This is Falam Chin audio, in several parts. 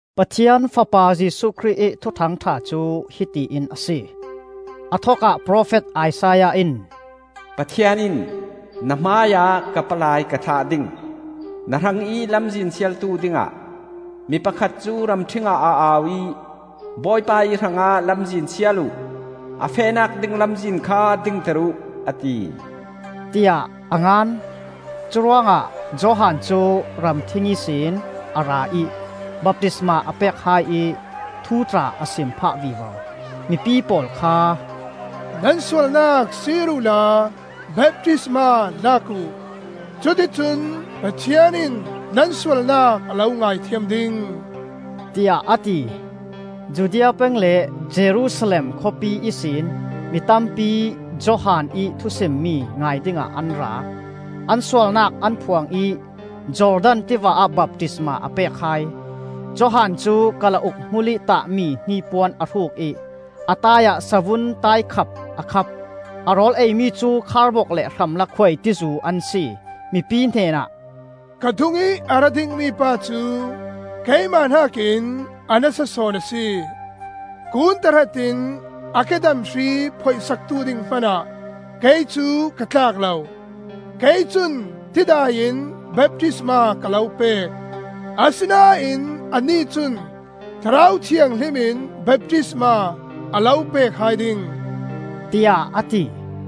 Pathian Fapa Jesuh Khrih ih Thuthang ṭha cu hiti in a si. A thokah profet Isaiah in: “Pathian in ‘Na hmaiah ka palai ka thlah ding; Na hrangih lamzin sialtu dingah,’ Mi pakhat cu ramṭhingah a au ih, ‘Bawipa ih hrangah lamzin sial uh, A fehnak ding lamzin kha dingter uh,’ a ti,” tiah a ngan. Curuangah Johan cu ramṭhing ihsin a ra ih baptisma a pek hai ih thu tla a sim phah vivo. Mipi pawl kha, “Nan sualnak sir uhla baptisma lak uh. Cuticun Pathian in nan sualnak a lo ngaithiam ding,” tiah a ti. Judea peng le Jerusalem khawpi ihsin mi tampi Johan ih thusimmi ngai dingah an ra. An sualnak an phuang ih Jordan tiva ah baptisma a pek hai. Johan cu kalauk hmulih tahmi hnipuan a hruk ih a taai ah savun taikhap a khap. A rawl eimi cu kharbok le hramlak khuaitizu an si. Mipi hnenah, “Ka dungih a ra dingmi pa cu keimah hnakin a nasa sawn a si. Kun tahrat in a kedam hri phoih saktu ding hmanah kei cu ka tlak lo. Kei cun tidai in baptisma ka lo pek. Asinain anih cun Thlarau Thianghlim in baptisma a lo pek hai ding,” tiah a ti.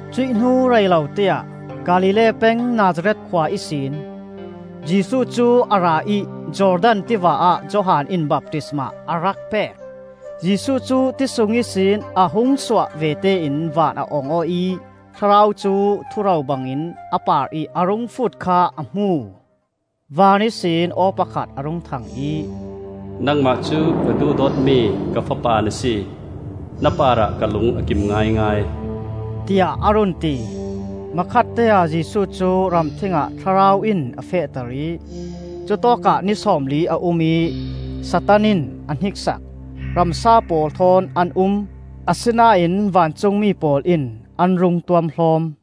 Cuih hnu rei loteah Galilee peng Nazareth khua ihsin Jesuh cu a ra ih Jordan tiva ah Johan in baptisma a rak pek. Jesuh cu ti sung ihsin a hung suah vete in van a ong aw ih Thlarau cu thuro bangin a parih a rung fut kha a hmu. Van ihsin aw pakhat a rung thang ih, “Nangmah cu ka duhdawtmi ka Fapa na si. Na parah ka lung a kim ngaingai,” tiah a run ti. Hmakhatteah Jesuh cu ramṭhing ah Thlarau in a fehter ih cutawkah ni sawmli a um ih Satan in a hniksak. Ramsa pawl thawn an um. Asinain vancungmi pawl in an rung tuamhlawm.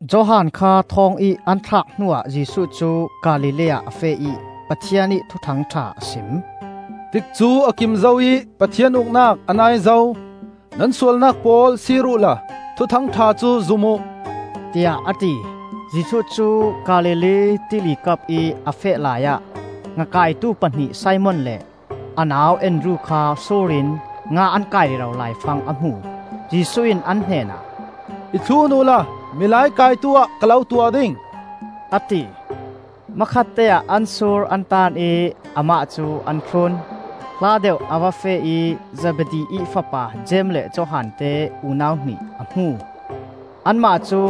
Johan kha thawngih an thlak hnuah Jesuh cu Galilee ah a feh ih Pathian ih Thuthang ṭha a sim. “Tikcu a kim zo ih Pathian Uknak a nai zo. Nan sualnak pawl sir uhla Thuthang ṭha cu zum uh,” tiah a ti. Jesuh cu Galilee Tili kapih a feh laiah ngakaitu pahnih Simon le a nau Andru kha sur in nga an kaih rero laifang a hmu. Jesuh in an hnenah, “I thlun uhla milai kaitu ah ka lo tuah ding,” a ti. Hmakhatteah an sur an taan ih amah cu an thlun. Hla deuh a va feh ih Zebedi ih fapa Jeim le Johan te unau hnih a hmu. Anmah cu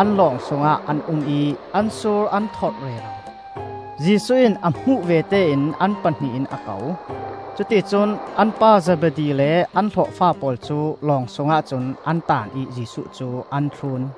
an lawng sungah an um ih an sur an tholh rero. Jesuh in a hmuh vete in an pahnih in a ko. Cuticun an pa Zebedi le an hlawhfa pawl cu lawng sungah cun an taan ih Jesuh cu an thlun.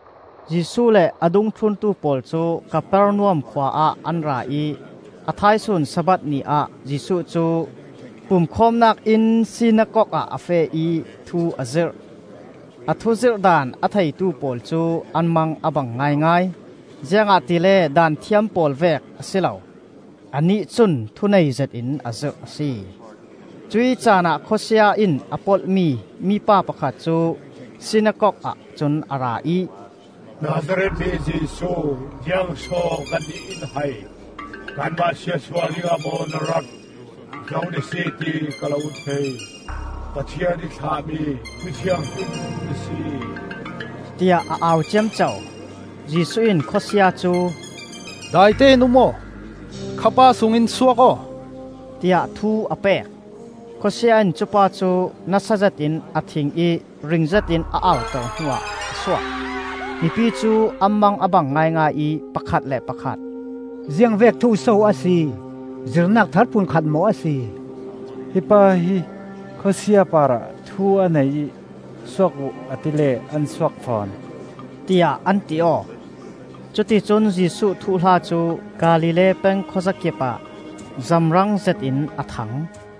Jesuh le a dungthluntu pawl cu Kapernaum khua ah an ra ih a thaisun Sabbath ni ah Jesuh cu pumkhawmnak inn Sinakok ah a feh ih thu a zirh. A thuzirh daan a theitu pawl cu an mang a bang ngaingai, ziangahtile Daanthiam pawl vek a si lo, anih cun thunei zetin a zirh a si. Cuih caanah khawsia in a polhmi mipa pakhat cu Sinakok ahcun a ra ih, “Nazareth mi Jesuh, ziangso kannih in hai? Kanmah siatsuah dingah maw na rat? Zo na si ti ka lo thei: Pathian ih thlahmi Mi Thianghlim na si,” tiah a au ciamco. Jesuh in khawsia cu, “Daite in um aw! Kha pa sung in suak aw!” tiah thu a pek. Khawsia in cupa cu nasa zetin a thin ih ring zetin a auter hnuah a suak. Mipi cu an mang a bang ngaingai ih pakhat le pakhat, “Ziangvek thu so a si? Zirhnak thar phun khat maw a si? Hi pa hi khawsia parah thu a nei ih ‘Suak uh!’ a tile an suak fawn,” tiah an ti aw. Cuticun Jesuh thuhla cu Galilee peng khuazakip ah zamrang zetin a thang.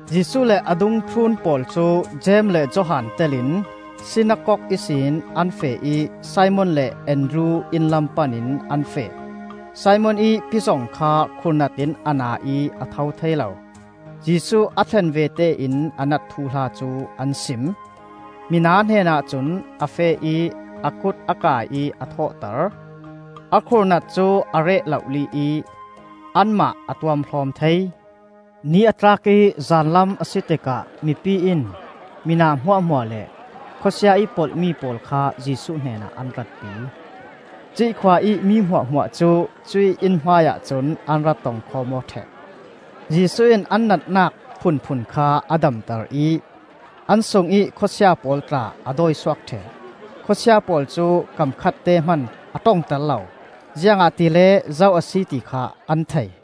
Jesuh le a dungthlun pawl cu Jeim le Johan tel in, sinakok ihsin an feh ih Simon le Andru inn lam pan in an feh. Simon ih pizon kha khurhnat in a na ih a tho thei lo; Jesuh a thlen vete in a nat thuhla cu an sim. Mina hnenah cun a feh ih a kut a kai ih a thawhter. A khurhnat cu a reh lohli ih anmah a tuamhlawm thei. Ni a tlak ih zanlam a si tikah mipi in mina hmuahhmuah le khawsia ih polhmi pawl kha Jesuh hnenah an rat pi. Cuih khua ih mi hmuahhmuah cu cuih inn hmai ahcun an ra tong khawm aw ṭheh. Jesuh in an natnak phunphun kha a damter ih an sungih khawsia pawl tla a dawisuak ṭheh. Khawsia pawl cu kam khatte hman a ṭongter lo; ziangahtile zo a si ti kha an thei.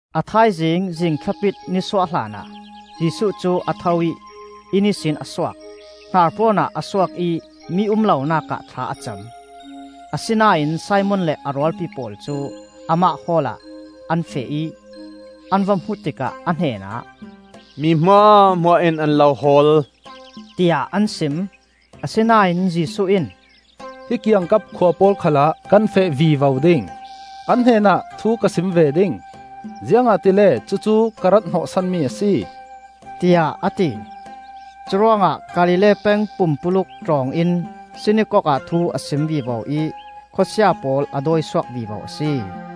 A thaizing, zingthlapit ni suah hlanah, Jesuh cu a tho ih inn ihsin a suak. Hnarpawn ah a suak ih mi um lonak ah thla a cam. Asinain Simon le a rualpi pawl cu amah hawl ah an feh ih, an va hmuh tikah a hnenah, “Mi hmuahhmuah in an lo hawl,” tiah an sim. Asinain Jesuh in, “Hi kiangkap khua pawl khalah kan feh vivo ding, an hnenah thu ka sim ve ding, ziangahtile cucu ka rat hnawhsanmi a si,” tiah a ti. Curuangah Galilee peng pumpuluk tlawng in sinakok ah thu a sim vivo ih khawsia pawl a dawi suak vivo a si.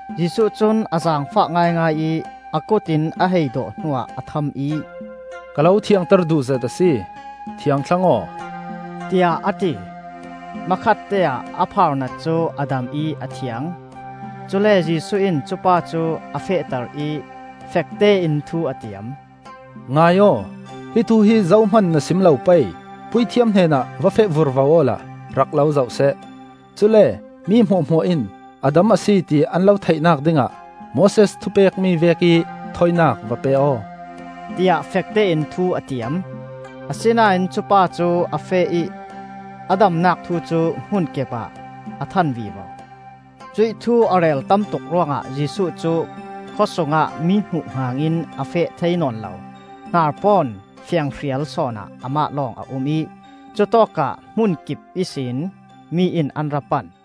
Jesuh cun a zaangfah ngaingai ih a kut in a hei dawh hnuah a tham ih, “Ka lo thiangter duh zet a si, thiang thlang aw,” tiah a ti. Hmakhatteah a phaarnat cu a dam ih a thiang. Cule Jesuh in cupa cu a fehter ih, fektein thu a tiam, “Ngai aw! Hi thu hi zohman na sim lo pei. Puithiam hnenah va feh vurvo awla rak lo zohseh; cule mi hmuahhmuah in a dam a si ti an lo theihnak dingah Moses thupekmi vekih thawinak va pe aw,” tiah fektein thu a tiam. Asinain cupa cu a feh ih a damnak thu cu hmunkip ah a than vivo. Cuih thu a rel tamtuk ruangah Jesuh cu khawsungah mi hmuhhngan in a feh thei nawn lo. Hnarpawn fianhrial sawnah amah lawng a um ih cutawkah hmunkip ihsin mi in an ra pan.